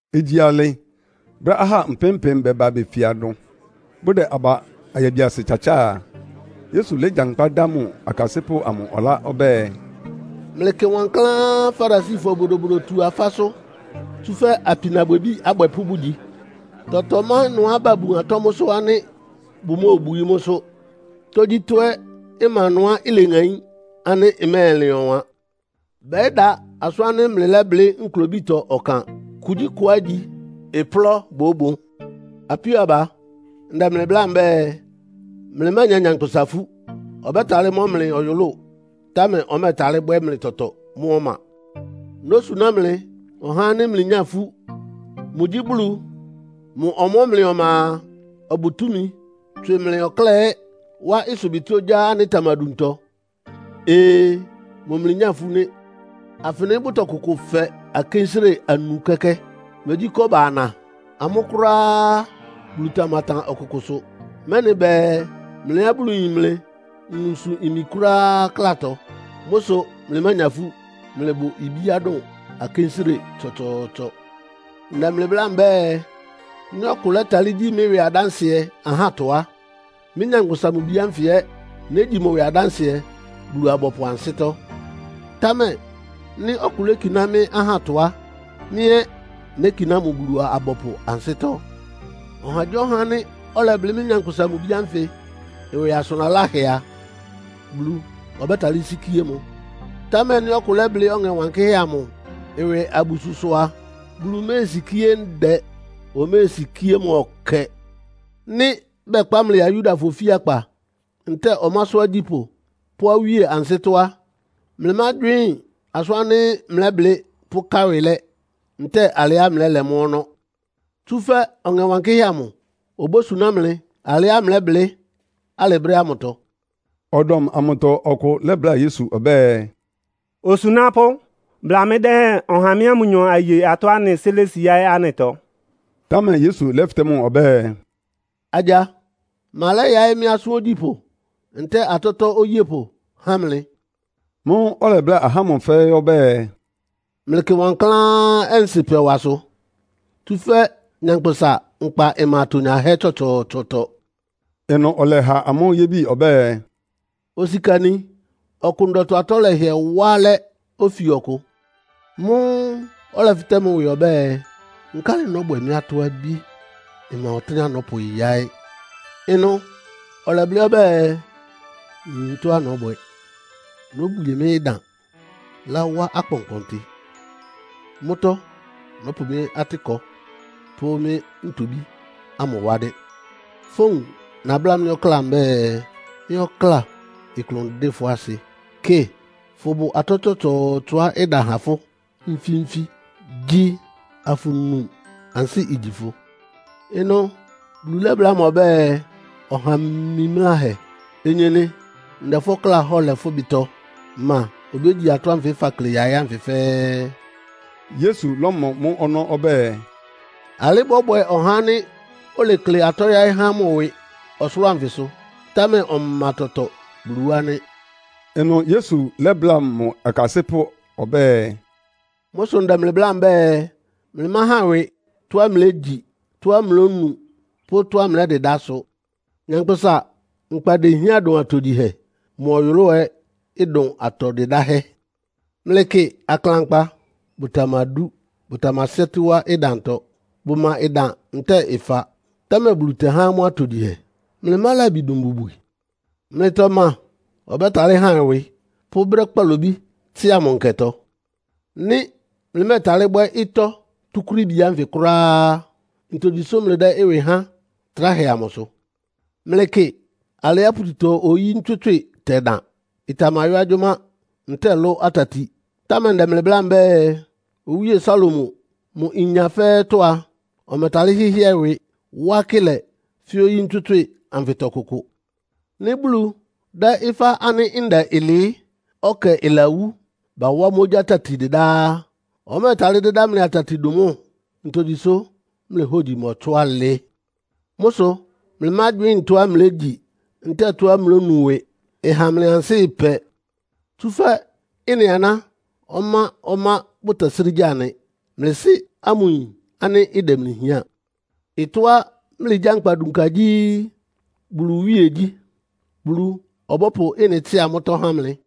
Igyi alɩ, brɛ́á ahá mpɩ́m-mpɩ́m bɛba befia ɩnʋ, bʋdɛ aba ayabiasɩ tsatsáa a, Yesu légyankpá dá mʋ akasɩ́pʋ́ amʋ ɔlá ɔbɛ́ɛ, “Mlɩkɩ wankláán Farisifɔ Bodobodotu-afásʋ́, tsúfɛ́ apinabwɛbí abwɛpʋ́ bʋgyi. Tɔtɔ má ɩnʋá babun atɔ́ mʋ́sʋ́ ánɩ́ bʋmóobwií mʋ́sʋ́. Tógyítɔ́ ɛ́ ma ɩnʋá ileŋaín ánɩ́ ɩmɛ́ɛlɩn ɔwan. Bɛ́da asʋ́n ánɩ́ mlɩlɛ́blɩ́ nklobítɔ ɔkan. Kugyíkʋá igyi, ɩplɔ́ bóbon. “Apíó aba, ndɛ mlɩ bláa mbɛ́ɛ, mlɩmánya nyankpʋsa ifú. Ɔbɛ́talɩ́ mɔ́ mlɩ ɔyʋlʋ́ʋ, támɛ ɔmɛ́ɛtalɩ́ bwɛ́ mlɩ tɔtɔ mʋ́ ɔma. Nósuná mlɩ ɔhá ánɩ́ mlɩnyá ifú. Mʋgyí Bulu. Mʋ ɔmɔ́ mlɩ ɔma a, ɔbʋ túmi tswɩ mlɩ ɔkláa ɛ́ wá ɩsʋbɩtɩ́ ogyá ánɩ́ ɩtamaduntɔ. Ee! Mʋ mlɩnyá ifú nɩ́! “Afɩnɩ bʋtɔkʋkʋ fɛ akénsire anu kɛ́kɛ́? Megyí kɔ́ba ana? Amʋ́ kʋ́ráá á, Bulu tamatan ɔkʋkʋsʋ, mɛ́nɩ bɛɛ mlɩá Bulu yin mlɩ nwunsʋ imi kʋ́ráá klátɔ. Mʋ́ sʋ mlɩmánya ifú. Mlɩbʋ ibíá dʋn akénsire tsɔtsɔɔtsɔ! “Ndɛ mlɩ bláa mbɛ́ɛ, nɩ́ ɔkʋ lɛ́talɩ́ gyi mɩ́ ɩwɩ adánsɩɛ ahátɔ á, mɩ́, Nyankpʋsa-Mʋ-Bi ánfɩ ɛ́ négyi mʋ ɩwɩ adánsɩɛ Bulu-abɔpʋ ansɩ́tɔ́. Támɛ nɩ́ ɔkʋ lékiná mɩ́ ahátɔ á, mɩ́ ɛ́ nékiná mʋ Bulu-abɔpʋ ansɩ́tɔ́. “Ɔhagyíɔha ánɩ́ ɔlɛblɩ́ mɩ́, Nyankpʋsa-Mʋ-Bi ánfɩ ɩwɩ asʋn laláhɛ a, Bulu ɔbɛ́talɩ́ sikíé mʋ. Támɛ nɩ́ ɔkʋ lɛ́blɩ́ Ɔŋɛ Wankɩ́hɛ́ amʋ ɩwɩ abususʋ a, Bulu méesikíé ndɛ, oméesikíé mʋ ɔkɛ. “Nɩ́ bɛkpá mlɩ ya Yudafɔ ofíakpa, ntɛ́ɛ ɔmásʋ́ agyípʋ́ pʋ́ awíe ansɩ́tɔ́ á, mlɩmágywɩ́ɩn asʋ́n ánɩ́ mlɛ́blɩ́ pʋ́ká ɩwɩ lɛ́ ntɛ́ɛ alɩá mlɛ́lɛ mʋ́ ɔnɔ́. Tsúfɛ́ Ɔŋɛ Wankɩ́hɛ́ amʋ obósuná mlɩ alɩá mlɛ́blɩ́ alɩ brɛ́ ámʋtɔ.” Ɔdɔm amʋtɔ ɔkʋ lɛ́bláa Yesu ɔbɛ́ɛ, “Osunápʋ́, bla mɩ́ dɛ́hɛn, ɔha mɩ́a mʋnyɔ aye atɔ́á anɩ sɩ́ lési yáɩ́ anɩtɔ.” Támɛ Yesu lɛ́fɩtɛ́ mʋ ɔbɛ́ɛ, “Agya, ma lɛ́yaɩ́ mɩ́ asʋ́n ogyípʋ́ ntɛ́ɛ atɔ́tɔ́ oyépʋ há mlɩ?” Mʋ́ʋ́ ɔlɛbláa ahá ámʋ fɛ́ɛ́ ɔbɛ́ɛ, “Mlɩkɩ wankláán ɔnsɩ́pɛwasʋ, tsúfɛ́ nyankpʋsa nkpa ɩma atonyahɛ́ tsɔtsɔɔtsɔtɔ.” Ɩnʋ ɔlɛha amʋ́ yébi ɔbɛ́ɛ, “Osikani ɔkʋ ndɔtɔ atɔ́ lɛhɩɛ wá alɛ́ ofi ɔkʋ. Mʋ́ʋ́ ɔlɛfɩtɛ́ mʋ ɩwɩ ɔbɛ́ɛ, ‘Nkálɩ nɔ́bwɛ mɩ́ atɔ́-abí? Mma ɔtɩ́nɛ́á nɔ́pʋyáɩ́.’ Ɩnʋ ɔlɛblɩ́ ɔbɛ́ɛ, ‘Nyin tɔ́á nɔ́bwɛ. Nóbwie mɩ́ ɩdan, láwá akpɔnkpɔntɩ. Mʋ́tɔ́ nɔ́pʋ mɩ́ atɩ́kɔ pʋ́ mɩ́ ntobí ámʋ wá nɩ́. Fówun nabláa mɩ́ ɔkláa mbɛ́ɛ, “Mɩ́ ɔkláa, ɩklʋn ɩdɩ́ fʋ́ asɩ. Kɩ, fʋbʋ atɔ́ tsɔtsɔɔtsɔá ɩda ha fʋ́ nfí-nfí. Gyi, afʋnu, ansɩ́ igyi fʋ.” ’ Ɩnʋ Bulu lɛ́bláa mʋ ɔbɛ́ɛ, ‘Ɔha mimláhɛ! Onyenɩ ndɛ fʋ́ ɔkláa hɔ́ɔ lɛ fʋ́ ɩbɩtɔ. Ma obégyi atɔ́ ánfɩ fakle yáɩ́ ánfɩ fɛ́ɛ́?’” Yesu lɔ́mɔ mʋ́ ɔnɔ́ ɔbɛ́ɛ, “Alɩ́ bɔ́bwɛ ɔhá ánɩ́ olekle atɔ́ yáɩ́ há mʋ ɩwɩ ɔsʋlʋ́ʋ anfɩsʋ, támɛ ɔma tɔtɔ Bulu wá nɩ́.” Ɩnʋ Yesu lɛ́bláa mʋ akasɩ́pʋ́ ɔbɛ́ɛ, “Mʋ́ sʋ ndɛ mlɩ bláa mbɛ́ɛ, mlɩmáhan ɩwɩ tɔ́á mlégyi, tɔ́á mlónu pʋ́ tɔ́á mlɛ́dɩdá sʋ. Nyankpʋsa nkpa dehián dʋn atogyihɛ. Mʋ ɔyʋlʋ́ʋ ɛ́ ɩdʋn atɔ dɩdáhɛ́. Mlɩkɩ aklankpa. Bʋtamadú, bʋtamasɩ́ɛ́tɩ́ wá ɩdantɔ. Bʋma ɩdan ntɛ́ɛ ɩfa, támɛ Bulu tɛhá amʋ́ atogyihɛ. Mlɩmá labi dʋn mbubwi? Mlɩtɔ ma ɔbɛ́talɩ́ han ɩwɩ pʋ́ brɛ́ kpalobí tsɩ́a mʋ nkɛtɔ? Nɩ́ mlɩmɛ́ɛtalɩ́ bwɛ́ ɩtɔ́ túkúrííbi ánfɩ kʋ́ráá á, ntogyi sʋ́ mlɩdɛ́ ɩwɩ háan tráhɛ amʋsʋ? Mlɩkɩ alɩá pututɔ-oyí ntswɩ́tswɩ́ɩ tɛdan. Ɩtamayɔ́ agyʋ́má ntɛ́ɛ lʋ́ atati. Támɛ ndɛ mlɩ bláa mbɛ́ɛ, Owíe Salomo, mʋ inya fɛ́ɛ́tɔ́ a, ɔmɛtalɩ́ hɩ́hɩɛ ɩwɩ wá akɩ́lɛ fɛ́ oyí ntswɩ́tswɩ́ɩ anfɩtɔ kʋkʋ. Nɩ́ Bulu dɛ́ ɩfá ánɩ́ ndɛ ɩlɩɩ́, ɔkɛ ɩlawú, bawá mʋ́ ogyá tati dɩdá á, ɔmɛ́ɛtalɩ́ dɩ́dá mlɩ atati dʋn mʋ́? Ntogyi sʋ́ mlɩ hógyi mɔtsɔ́ alɩ? “Mʋ́ sʋ mlɩmágywɩ́ɩn tɔ́á mlégyi ntɛ́ɛ tɔ́á mlónu ɩwɩ, ɩha mlɩ ansɩ́ ɩpɛ. Tsúfɛ́ ɩ́nɩ aná ɔmá-ɔmá bʋtɛsrɩ́ gya nɩ. Mlɩ Sɩ́ ámʋ yin ánɩ́ ɩdɛ mlɩ hián. Ɩtɔ́á mlɩgyánkpa dunka gyí Bulu iwíegyí, Bulu ɔbɔ́pʋ ɩ́nɩ tsɩ́a mʋ́tɔ́ há mlɩ.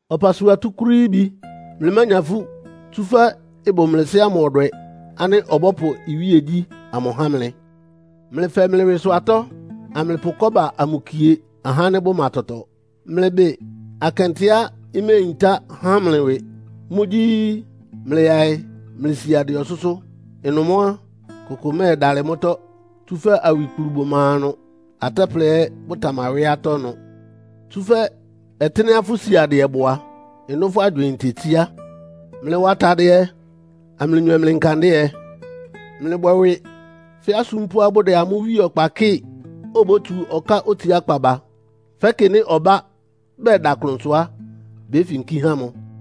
“Ɔpasua túkúrííbi, mlɩmánya ifú. Tsúfɛ́ ɩbʋ mlɩ Sɩ́ ámʋ ɔdwɛ ánɩ́ ɔbɔ́pʋ iwíe ogyíkpá amʋ há mlɩ. Mlɩfɛ mlɩ ɩwɩsʋ atɔ́, amlɩpʋ kɔ́ba amʋ kie ahá ánɩ́ bʋma tɔtɔ. Mlɩbɩn akɛntɛá iméeyintá ha mlɩ ɩwɩ. Mʋ́gyí, mlɩyaɩ mlɩ siadɩɛ ɔsʋ́sʋ́. Ɩnʋ mʋ́ á, kʋkʋ mɛ́ɛdalɩ mʋ́tɔ́, tsúfɛ́ awikplu bʋma ɩnʋ, atɛ́plɛ ɛ́ bʋtamawɩ́ atɔ́ ɩnʋ. Tsúfɛ́ ɔtɩ́nɛ́á fʋ́ siadɩɛ bʋ a, ɩnʋ́ fʋ́ agywɩɩn tetsíá. “Mlɩwa atadɩɛ, amlɩnywɛ mlɩ nkandɩ́ɛ. Mlɩbwɛ ɩwɩ fɛ́ asúmpʋ́á bʋdɛ amʋ́ wíe ɔkpa kɩ́ɩ, obótsu ɔká otsiákpá ba. Fɛ́kɩ nɩ́ ɔbá bɛda klʋnsʋ á, béfinkí há mʋ.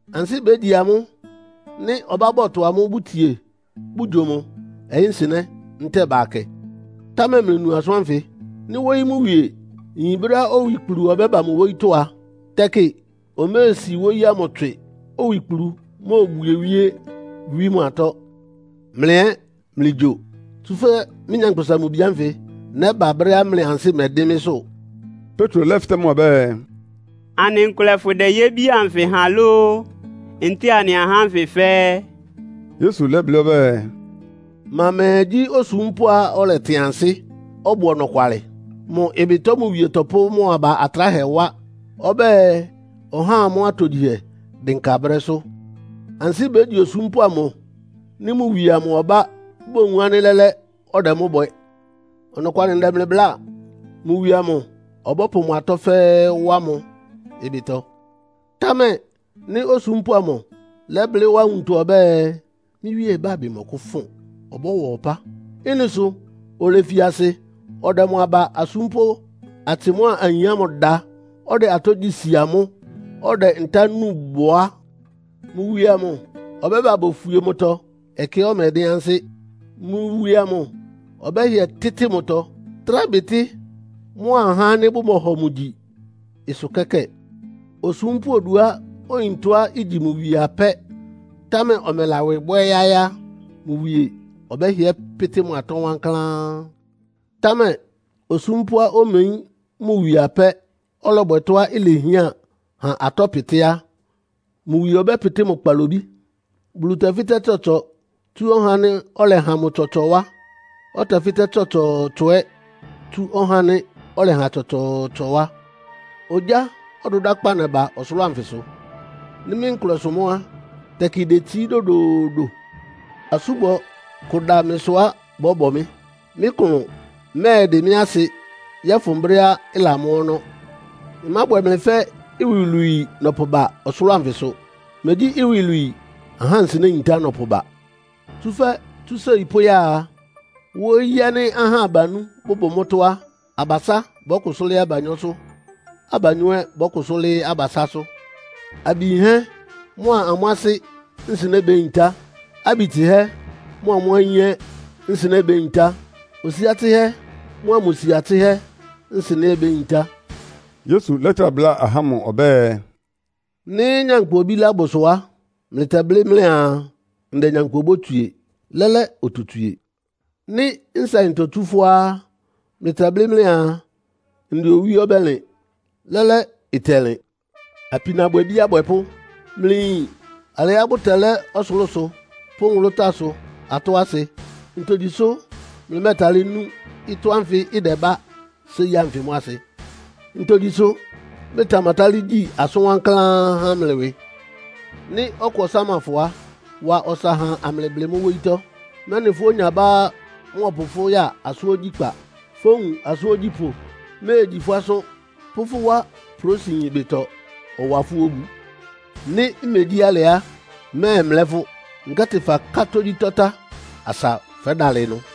Ansɩ́ bégyi amʋ́, nɩ́ ɔbá bɔtʋ amʋ́ bʋtsie bʋgyo mʋ, ɔyɩ́nsɩnɛ́ ntɛ́ɛ bakɛ. Támɛ mlɩnu asʋ́n ánfɩ. Nɩ́ wóyí mʋ wie yin brɛ́á owikplu ɔbɛ́ba mʋ wóyítɔ́ a, tɛkɩ omesi wóyí ámʋ tswɩ, owikplu móbwie wíé wí mʋ atɔ́. Mlɩ ɛ́ mlɩgyo, tsúfɛ́ mɩ́, Nyankpʋsa-Mʋ-Bi ánfɩ nɛ́ba brɛ́á mlɩ ansɩ́ mɛdɩ́n mɩ́sʋ́.” Petro lɛ́fɩtɛ́ mʋ ɔbɛ́ɛ, “Anɩ nkʋlɛ fʋdɛ yébi anfɩ ha lóó, ntɛ́ɛ anɩa ahá ánfɩ fɛ́ɛ́?” Yesu lɛ́blɩ́ ɔbɛ́ɛ, “Ma mɛɛ gyí osúmpʋ́á ɔlɛtɩn ansɩ́, ɔbʋ ɔnɔkwalɩ? Mʋ ɩbɩtɔ mʋ wie tɔpʋ́ mʋ aba atráhɛ wá, ɔbɛ́ɛ ɔhá amʋ́ atogyihɛ dɩnka brɛ́sʋ́. Ansɩ́ bégyi osúmpʋ́ amʋ nɩ́ mʋ wie amʋ ɔbá bowun ánɩ́ lɛ́lɛ́ ɔdɛ mʋ́ bwɛ. Ɔnɔkwalɩ ndɛ mlɩ bláa. Mʋ wie amʋ ɔbɔ́pʋ mʋ atɔ́ fɛ́ɛ́ wá mʋ ɩbɩtɔ. Támɛ nɩ́ osúmpʋ́ amʋ lɛ́blɩ́ wá nwuntɔ ɔbɛ́ɛ, ‘Mɩ́ wíe ɩbábɩ mɔkʋ́fʋn, ɔbɔ́wa ɔpá.’ Ɩ́nɩ sʋ olefi asɩ ɔdɛ mʋ aba asúmpʋ́ atsɩ mʋ́a ayin da, ɔdɛ atɔ́ gyí si amʋ́, ɔdɛ ntá núu bʋ á, mʋ wie amʋ ɔbɛ́ba bofwie mʋtɔ ɛkɛá ɔmɛdɩ́n ansɩ́. Mʋ wie amʋ ɔbɛ́hɩɛ tɩ́tɩ mʋtɔ, trá bɩtɩ́ mʋa ahá ánɩ́ bɔmɔhɔ mʋ gyi ɩsʋ kɛ́kɛ́ɛ. “Osúmpʋ́ oduá oyin tɔ́á igyi mʋ wie apɛ́, támɛ ɔmɛla ɩwɩ bwɛ́ yáɩ́ á, mʋ wie ɔbɛ́hɩɛ pɩ́tɩ́ mʋ atɔ́ wankláán. Támɛ osúmpʋ́á omeyín mʋ wie apɛ́, ɔlɔbwɛ tɔ́á ilehián ha atɔ́ pɩtɩ́ á, mʋ wie ɔbɛ́pɩtɩ́ mʋ kpalobí. Bulu tɛfɩ́tɛ́ tsɔtsɔ tsú ɔhá ánɩ́ ɔlɛha mʋ tsɔtsɔ wá, ɔtɛfɩ́tɛ́ tsɔtsɔɔtsɔ ɛ́ tsú ɔhá ánɩ́ ɔlɛha tsɔtsɔɔtsɔ wá. “Ogyá ɔdʋdákpá nɛba ɔsʋlʋ́ʋ anfɩsʋ. Nɩ́ mɩ́ nkʋlɛ sʋ mʋ́ á, tɛkɩ idetsií dodoodo. Asúbɔ kʋ ɩda mɩsʋá bɔ́bɔ mɩ́. Mɩ́ klʋn mɛ́ɛdɩ mɩ́ asɩ yɔ́fʋn brɛ́á ɩlamɔ́ ɔnɔ́. Ɩmábwɛ mlɩ fɛ́ iwilwii nɔpʋba ɔsʋlʋ́ʋ anfɩsʋ. Megyí iwilwii, ahá nsɩnɛ́ yintá nɔpʋba. Tsúfɛ́ tsú séi pʋ́ya a, wóyí ánɩ́ ahá abanú bʋbʋ mʋ́tɔ́ á, abasá bɔ́kʋsʋ́ lɩ́ɩ́ abanyɔ́sʋ́. Abanyɔ́ ɛ́ bɔ́kʋsʋ́ lɩ́ɩ́ abasásʋ́. Abi yinhɛ́ mʋ́a amʋ́ asɩ́ nsɩnɛ́ béyintá. Abi tsɩhɛ́ mʋ́a amʋ́ ayín ɛ́ nsɩnɛ́ béyintá. Osia tsɩhɛ́ mʋ́a mʋ sia tsɩ́hɛ́ nsɩnɛ́ ɛ́ béyintá.” Yesu lɛ́trá bláa ahá ámʋ ɔbɛ́ɛ, “Nɩ́ nyankpʋ obílá bʋsʋ á, mlɩtɛblɩ́ mlɩaa, ndɛ nyankpʋ obótswie, lɛ́lɛ́ ototswie. Nɩ́ nsaɩntɔ itsú fʋ́á á, mlɩtɛblɩ́ mlɩaa, ndɛ owí ɔbɛ́lɩn, lɛ́lɛ́ ɩtɛlɩn. Apinabwɛbí abwɛpʋ́! Mlɩyin alɩá bʋtɛlɛ́ ɔsʋlʋ́sʋ pʋ́ nwʋlʋ́táasʋ atɔ́ asɩ. Ntogyi sʋ́ mlɩmɛ́tálɩ́ nú ɩtɔ́ ánfɩ ɩdɛbá séi ánfɩ mʋ́ asɩ? “Ntogyi sʋ́ mlɩtamatálɩ́ gyí asʋ́n wankláán há mlɩ ɩwɩ? Nɩ́ ɔkʋ ɔsáma fʋ á, wa ɔsa ha amlɩblɩ mʋ́ wóyítɔ́, mɛ́nɩ fʋ́ onyabá mɔ́ɔpʋ fʋ́ ya asʋ́n ogyíkpá. Fówun asʋ́n ogyípʋ́ méegyi fʋ́ asʋ́n, pʋ́ fʋ́ wá prósiyin ɩbɩtɔ, ɔwa fʋ́ obu. Nɩ́ megyí alɩ á, mmɛ́ɛmlɛ́ fʋ́, nkɛ́tɩ faká tógyítɔ́ tá asa fɛ́dalɩ ɩnʋ.”